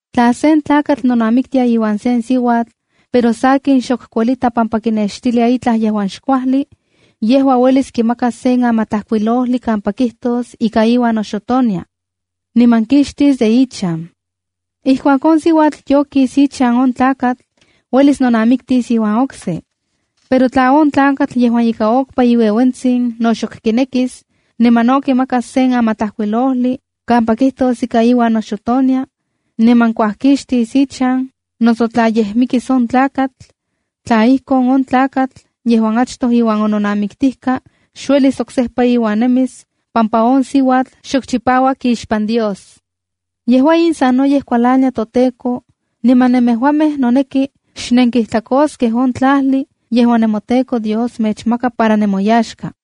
’Tla sen tlakatl nonamiktia iuan sen siuatl, pero sakin, xok kuelita pampa kinextilia itlaj yejuan xkuajli, yejua uelis kimakas sen amatlajkuilojli kampa kijtos ika iuan noxotonia, niman kixtis de ichan. Ijkuak on siuatl yokis ichan on tlakatl, uelis nonamiktis iuan okse. Pero tla on tlakatl yejuan ika okpa iueuentsin no xok kinekis, niman no kimakas sen amatlajkuilojli kampa kijtos ika iuan noxotonia, niman kuajkixtis ichan, noso tla yej mikis on tlakatl, tla ijkon, on tlakatl yejuan achtoj iuan ononamiktijka xuelis oksejpa iuan nemis pampa on siuatl xok chipauak ixpan Dios. Yejua in sanoyej kualania toTEKO, niman nemejuamej noneki xnenkijtlakoskej on tlajli yejuan nemoTEKO Dios mechmaka para nemoyaxka.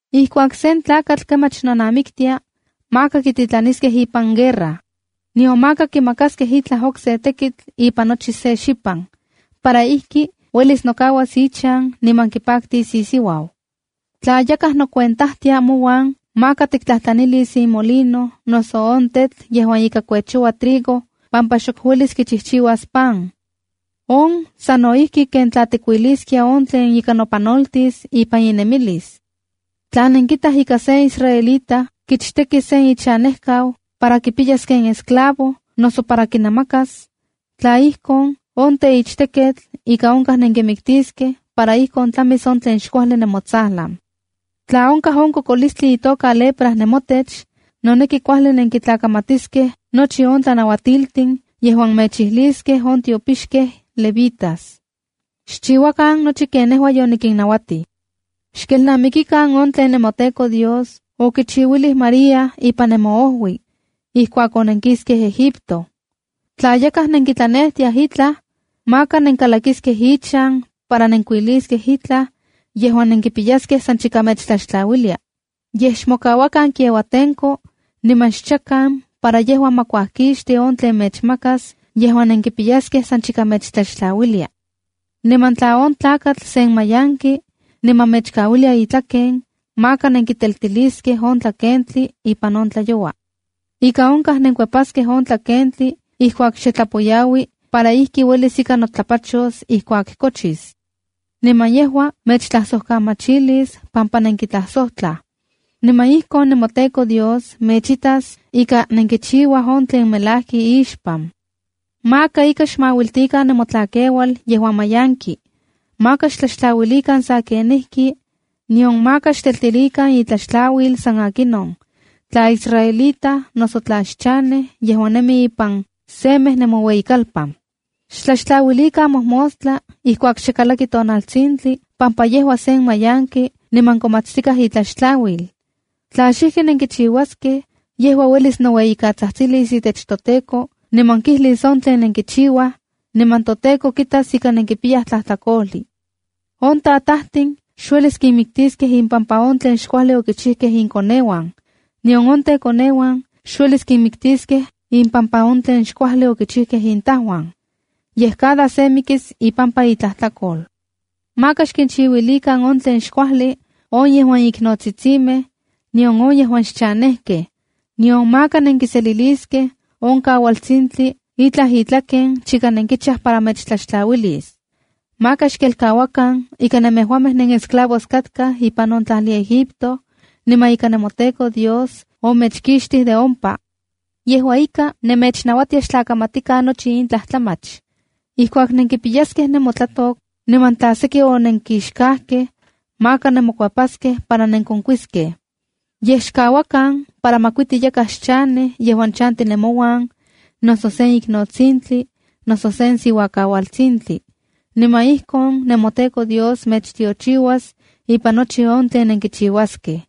’Ijkuak sen tlakatl kemach nonamiktia, maka kititlaniskej ipan guerra, nion maka kimakaskej itlaj okse tekitl ipan nochi se xipan, para ijki uelis nokauas ichan niman kipaktis isiuau. ’Tla yakaj nocuentajtia mouan, maka tiktlajtlanis imolino noso on tetl yejuan ika kuechouaj trigo pampa xok uelis kichijchiuas pan. On sa no ijki ken tla kuiliskiaj on tlen ika nopanoltis ipan inemilis. ’Tla nenkitaj ika sen israelita kichteki sen ichanejkau, para kipiyas ken esclavo noso para kinamakas, tla ijkon, on teichtekketl ika onkaj nenkimiktiskej para ijkon tlamis on tlen xkuajli nemotsajlan. ’Tla onkaj on kokolistli itoka lepra nemotech, noneki kuajli nenkitlakamatiskej nochi on tlanauatiltin yejuan mechijliskej on tiopixkej levitas. Xchiuakan nochi ken nejua yonikinnauatij. Xkelnamikikan on tlen nemoTEKO Dios okichiuilij María ipan nemoojui, ijkuak onenkiskej Egipto. ’Tla yakaj nenkitlanejtiaj itlaj, maka nenkalakiskej ichan para nenkuiliskej itlaj yejuan nenkipiyaskej san chika mechtlaxtlauilia. Yej xmokauakan kiauatenko niman xchakan, para yejua ma kuajkixti on tlen mechmakas yejuan nenkipiyaskej san chika mechtlaxtlauilia. Niman tla on tlakatl sen mayanki, niman mechkauilia itlaken, maka nenkiteltiliskej on tlakentli ipan on tlayoua. Ika onkaj nenkuepaskej on tlakentli ijkuak xe tlapoyaui para ijki uelis ika notlapachos ijkuak kochis. Niman yejua mechtlajsokamachilis pampa nenkitlajsojtlaj. Niman ijkon nemoTEKO Dios mechitas ika nenkichiuaj on tlen melajki ixpan. ’Maka ika xmauiltikan nemotlakeual yejuan mayanki. Maka xtlaxtlauilikan sa kenijki, nion maka xteltilikan itlaxtlauil san akinon, tla israelita noso tla xchanej yejuan nemi ipan semej nemoueyikalpan. Xtlaxtlauilikan mojmostla ijkuak xe kalaki tonaltsintli pampa yejua sen mayanki niman konmatstikaj itlaxtlauil. Tla xijki nenkichiuaskej, yejua uelis noueyikatsajtsilis itech toTEKO niman kijlis on tlen nenkichiuaj, niman toTEKO kitas ika nenkipiyaj tlajtlakojli. ’On tatajtin xuelis kinmiktiskej ipampa on tlen xkuajli okichijkej inkoneuan, nion on tekoneuan xuelis kinmiktiskej ipampa on tlen xkuajli okichijkej intajuan. Yej cada se mikis ipampa itlajtlakol. ’Maka xkinchiuilikan on tlen xkuajli on yejuan iknotsitsimej, nion on yejuan xchanejkej. Nion maka nenkiseliliskej on kaualtsitsintli itlaj itlaken chika nenkichaj para mechtlaxtlauilis. Maka xkelkauakan ika nemejuamej nenesclavos katkaj ipan on tlajli Egipto, niman ika nemoTEKO Dios omechkixtij de ompa. Yejua ika, nemechnauatia xtlakamatikan nochi in tlajtlamach. ’Ijkuak nenkipixkaskej nemotlatok niman tla seki onenkixkajkej, maka nemokuepaskej para nenkonkuiskej. Yej xkauakan para makuiti yakaj xchanej yejuan chanti nemouan, noso sen iknotsintli, noso sen siuakaualtsintli. Niman ijkon nemoTEKO Dios mechtiochiuas ipan nochi on tlen nenkichiuaskej.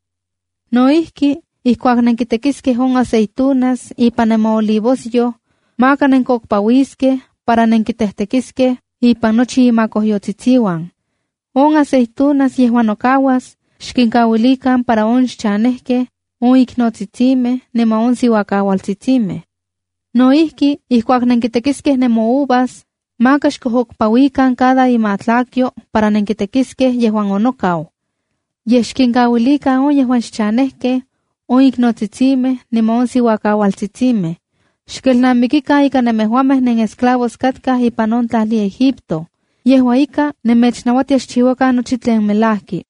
’No ijki, ijkuak nenkitekiskej on aceitunas ipan nemoolivoskojyoj, maka nenkokpauiskej para nenkitejtekiliskej ipan nochi imakojyotsitsiuan. On aceitunas yejuan nokauas, xkinkauilikan para on xchanejkej, on iknotsitsimej niman on siuakaualtsitsimej. ’No ijki, ijkuak nenkitekiskej nemouvas, maka xkojokpauikan cada imatlakyo para nenkitekiskej yejuan onokau. Yej xkinkauilikan on yejuan xchanejkej, on iknotsitsimej niman on siuakaualtsitsimej. Xkelnamikikan ika nemejuamej nenesclavos katkaj ipan on tlajli Egipto. Yejua ika, nemechnauatia xchiuakan nochi tlen melajki.